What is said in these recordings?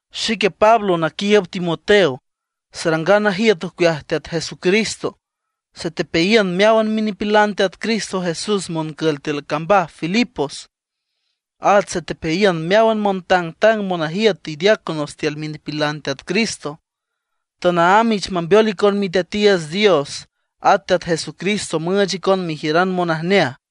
Xique Pablo naquiiüb Timoteo, sarangan najiüt ocueaj Teat Jesucristo, satepeayiün meáwan minipilan Teat Cristo Jesús moncül tiül cambaj Filipos. At satepeayiün meáwan montangtang monajiüt y diáconos tiül minipilan Teat Cristo. Tanaámb ich mambeol icon Miteatiiüts Dios at Teat Jesucristo müüch icon mejiüran monajneaj.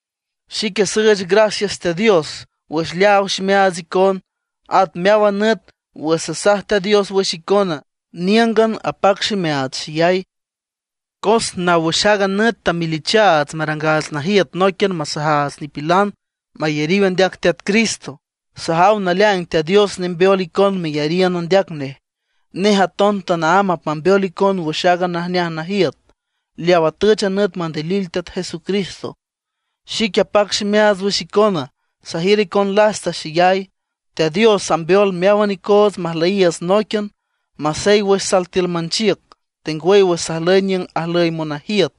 Xique süüch gracias Teat Dios wüx leaaw ximeaats icon. At meáwan nüt wüx sasaj Teat Dios wüx icona, níüngan apac ximeaats xeyay. Cos naw wüx aaga nüt tamelichaats marangaats najiüt nóiquian masajaats nipilan mayariw andeac Teat Cristo; sajaw naleaing Teat Dios nembeol icon meyariün andeac nej. Nej aton tanaámb apmambeol icon wüx aaga najneaj najiüt, leaw atüch a nüt mandilil Teat Jesucristo. Xique apac ximeaats wüx icona, sajiür icon lasta xeyay. Teat Dios ambeol meáwan icoots majlüyiiüts nóiquian, masey wüx sal tiül manchiüc, tengwüy wüx sajlüy niüng ajlüy monajiüt,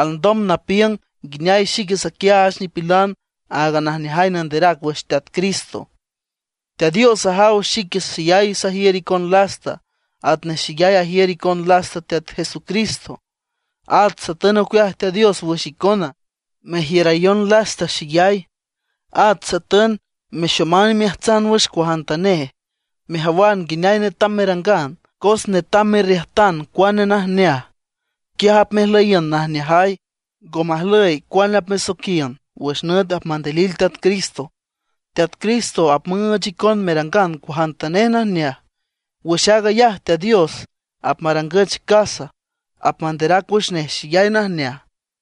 alndom napiüng nguineay xique saquiaach nipilan aaga Najneajay Nanderac wüx Teat Cristo. Teat Dios ajaw xique xeyay sajiür icon lasta atnej xeyay ajiür icon lasta Teat Jesucristo. At satün ocueaj Teat Dios wüx icona, merjiürayon lasta xeyay. At satün mexoman imeajtsan wüx cuajantanej, mejawan nguineay netam merangan. Cos netam merriüjtan cuane najneaj, quiaj apmejlüyiün najneajay, ngo majlüy cuane apmesoiquian wüx nüt apmandilil Teat Cristo. Teat Cristo apmüüch icon merangan cuajantanej najneaj. Wüx aag ayaj Teat Dios apmarangüch casa, apmanderac wüx nej xeyay najneaj.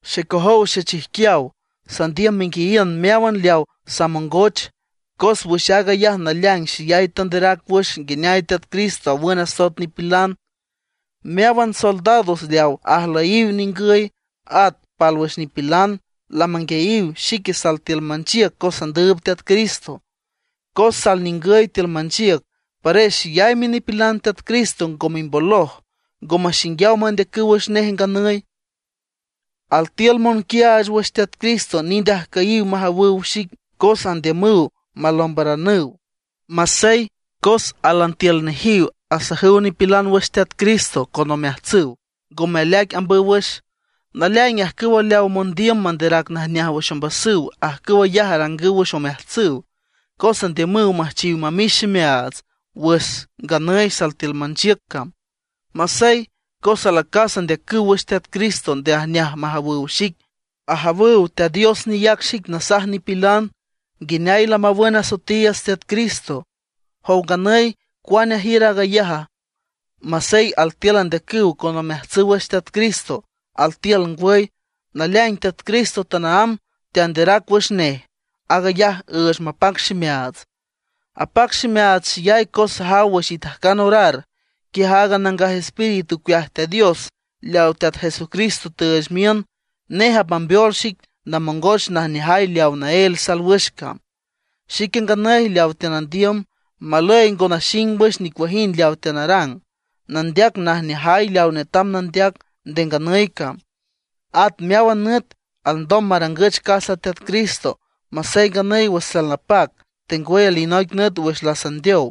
Xecojow xechijquiaw, sandiüm menguiayiün meáwan leawa samongoch, cos wüx aag ayaj naleaing xeyay teanderac wüx nguineay Teat Cristo awün asoet nipilan. Meáwan soldados leaw ajlüyiw ningüy, at pálwüx nipilan, lamanguiayiw xique sal tiül manchiüc cos sandüüb Teat Cristo. Cos sal ningüy tiül manchiüc, pares xeyay minipilan Teat Cristo ngo mimboloj, ngo maxinguiaw mandeacüw wüx nej nganüy. Altiül monquiaach wüx Teat Cristo nind ajcüyiw majawüw xic cos andiümüw malombaranüw. Masey, cos álan tiül nejiw asajüw nipilan wüx Teat Cristo con omeajtsüw, ngome aleaic ambüw wüx. Naleaing ajcüwa leaw mondiüm manderac najneaj wüx ombasüw, ajcüw ayaj arangüw wüx omeajtsüw, cos andiümüw müjchiw mamix ximeaats wüx nganüy sal tiül manchiüc cam. Masey, cos alacas andeacüw wüx Teat Cristo nde ajneaj majawüw xic, ajawüw Teat Dios neyac xic nasaj nipilan nguineay lamawün asoetiiüts Teat Cristo. ¿Jow nganüy cuane ajiür aag ayaja? Masey altiül andeacüw con omeajtsüw wüx Teat Cristo, altiül ngwüy. Naleaing Teat Cristo tanaámb teanderac wüx nej; aag ayaj üüch mapac ximeaats. Apac ximeaats xeyay cos sajaw wüx itajcan orar, quiaj aaga Nangaj Espíritu ocueaj Teat Dios leaw Teat Jesucristo tüüch miün, nej apmambeol xic namongoch najneajay leawa naél sal wüx cam. Xique nganüy leawa teanandiüm, malüy ngo naxing wüx nicuajind leaw teanarang, nandeac najneajay leaw netam nandeac nde nganüy cam, at meáwan nüt alndom marangüch casa Teat Cristo, masey nganüy wüx salnapac, tengwüy alinoic nüt wüx lasandeow.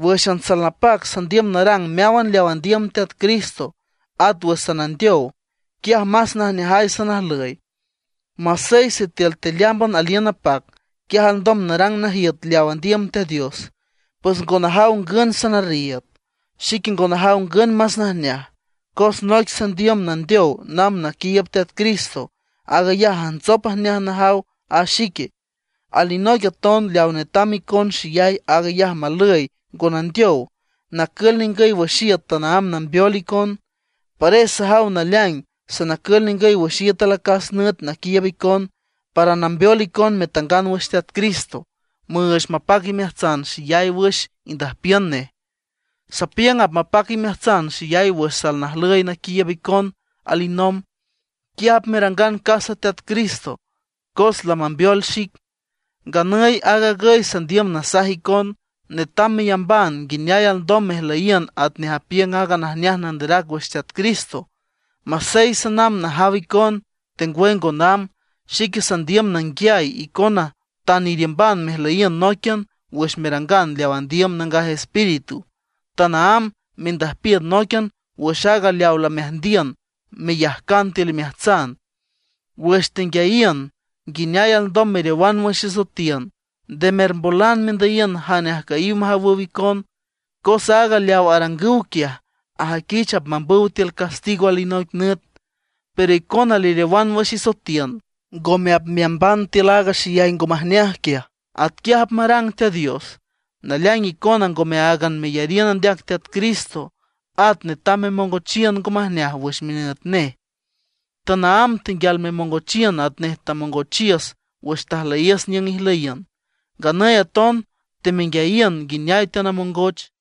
Wǘxan salnapac sandiüm narang meáwan leaw andiüm Teat Cristo; at wüx sanandeow, quiaj más najneajay sanajlüy. Masey sitiül tealeámban aliün napac, quiaj alndom narang najiüt leaw andiüm Teat Dios; pues ngo najaw ngün sanarriiüd. Xique ngo najaw ngün más najneaj, Cos noic sandiüm nandeow namb naquiiüb Teat Cristo, aag ayaj najntsop ajneaj najaw a xique. Alinoic aton leaw netam icon xeyay, aag ayaj malüy ngo nandeow, nacül ningüy wüx iüt tanaámb nambeol icon. Pares sajaw naleaing sanacül ningüy wüx iüt alacas nüt naquiiüb icon, para nambeol icon metangan wüx Teat Cristo, nüüch mapac imeajtsan xeyay wüx indüjpiün nej. Sapiüng apmapac imeajtsan xeyay wüx sanajlüy naquiiüb icon alinomb. Quiaj apmerangan casa Teat Cristo, cos lamambeol xic. Nganüy aag agüy sandiüm nasaj icon: netam meyamban nguineay alndom mejlüyiün atnej apiüng aaga najneaj nanderac wüx Teat Cristo. Masey sanamb najaw icon, tengwüy ngo namb, xique sandiüm nanguiay icona tan iriümban mejlüyiün nóiquian wüx merangan leaw andiüm Nangaj Espíritu; tanaámb mendüjpiün nóiquian wüx aaga leaw lameajndiün meyajcan tiül imeajtsan, wüx tenguiayiün nguineay alndom meriowan wüx isoetiün. Nde mermbolan mendüyiün jane ajcüyiw majawüw icon, cos aaga leaw arangüw quiaj ajüiquich apmambüw tiül castigo alinoic nüt. Pero icona leriowan wüx isoetiün, ngome apmeamban tiül aaga xeyay ngo majneaj quiaj. Atquiaj apmarang Teat Dios. Naleaing icona ngome áagan meyariün andeac Teat Cristo, at netam memongochiün ngo majneaj wüx minüt nej. Tanaámb tenguial memongochiün atnej tamongochiüs wüx tajlüyiüs niüng ijlüyiün; nganüy aton temenguiayiün nguineay teanamongoch.